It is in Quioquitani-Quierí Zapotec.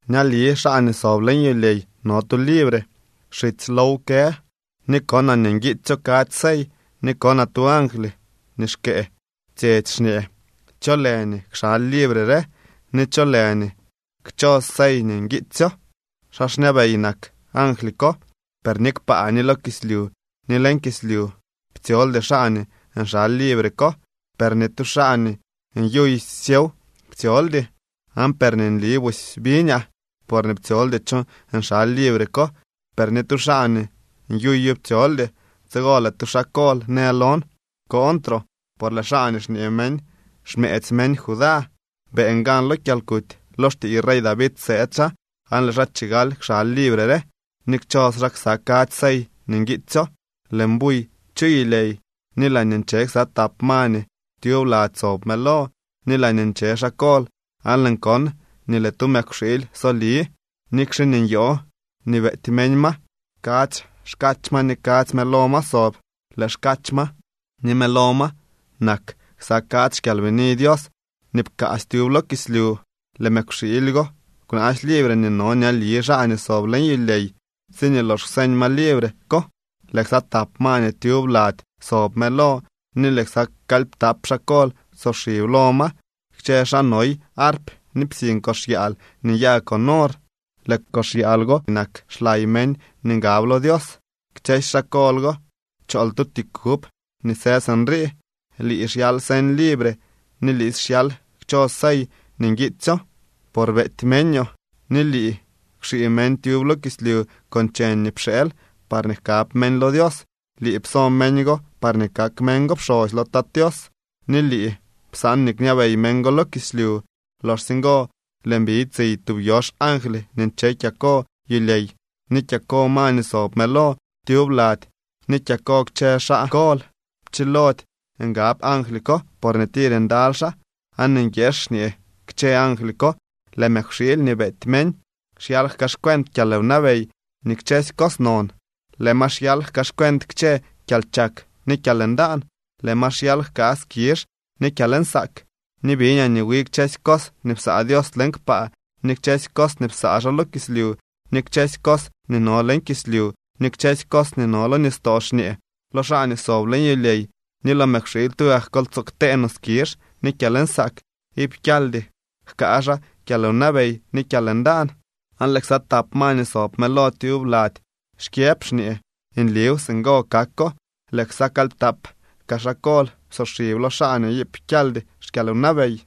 Ñali xaa nii sob leñ yulyey no tu libre. Xitsy low kë, ni konaa nii nguiitsyo kadzy sey. Ni konaa tu angly nii xkëë tsyetsy xñee: —¿Cho lë nii kxaly libre re ni cho lë nii kchos sey nii nguitsyo? Xaa xñabey nak angly ko. Per ni kpaa, ni lo kislyu, ni leñ kislyu ptsyoldy xaa nii nxaly libre ko, per ni tu xaa nii nyuy syew ptsyoldy. Aan per nii nli busy biñaa, porñee ptsyoldy cho nxaly libre ko, per ni tu xaa nii nyuyo ptsyoldy. Tsigo lëë tu xaa kol në lon: —Kooñtroo, por lëë xaa nii xñee meñ xmëëdzy meñ Judá beeñ gan lo kyalkuty. Lo xtiiy rey David sëëd xaa aan lëë xaa chigal kxaly libre re ni kchos xaa ksa kadzy sey nii nguitsyo. Lëën buy chu yulyey ni laañee nche ksa tap ma nii tyub lady sob mëlo ni laañee nche xaa kol aan lëën kon nii lëë tu mëkwxiily soli, nikxe nii nyoo nii beety meñ ma. Kadzy xkach ma ni kadzy mëlo ma sob. Lëë xkach ma ni lëë mëlo ma nak ksa kadzy xkyalbini Dios nii pkaasy tyub lo kislyu. Lëë mëkwxiily go kwnaasy libre nii no ñali xaa nii sob leñ yulyey. Tsiñee lox kwseñ ma libre ko, lëë ksa tap ma nii tyub lady sob mëlo ni lëë ksa kalyptap xaa kol psoxib lo ma. Kchë xaa noy arp ni psiñ kox yaal nii nyaa con or. Lëë kox yaal go nak xlay meñ nii ngab lo Dios. Kchësy xaa kol go chool tu ti kub nii së sinrii: Lii xyal señ libre ni liisy xyal kchos sey nii nguitsyoo, por beety meñoo, ni lii kwxii meñ tyub lo kislyu con cheñ nii pxeel parñee jkab meñ lo Dios. Lii pso meñ go parñee kak meñ go pxosy lo Tat Tios ni lii psaan nii kñabey meñ go lo kislyu. Loxsye ngo lëën biñ tsiy tub yox angly nii nche kyako yulyey, ni kyako ma nii sob mëlo tyub lady ni kyako kchë xaa kol. Pchilody ngab angly ko porñee tir ndaly xaa, aan nguieex xñee kchë angly ko: Lëë mëkwxiily nii beety meñ xyal jkaaxcuent kyalwnabey ni kchësy cos non. Lëë ma xyal jkaaxcuent kchë kyalchak ni kyalndaan, lëë ma xyal jkaa skizh ni kyalnsaak. Ni biñaa nii wi kchësy cos nii psaa Dios leñ kpaa ni kchësy cos nii psaa xaa lo kislyu, ni kchësy cos nii no leñ kislyu, ni kchësy cos nii no lo nistoo xñee: Lo xaa nii sob leñ yulyey ni lo mëkwxiily tugak kol tsoo ktee no skizh ni kyalnsaak, iip kyaldy jkaa xaa kyalwnabey ni kyalndaan. Aan lëë ksa tap ma nii sob mëlo tyub lady xkyëb xñee: —¡Nliw, singo kako! Lëë ksa kalyptap kaa xaa kol psoxib lo xaa nii iip kyaldy xkyalwnabey.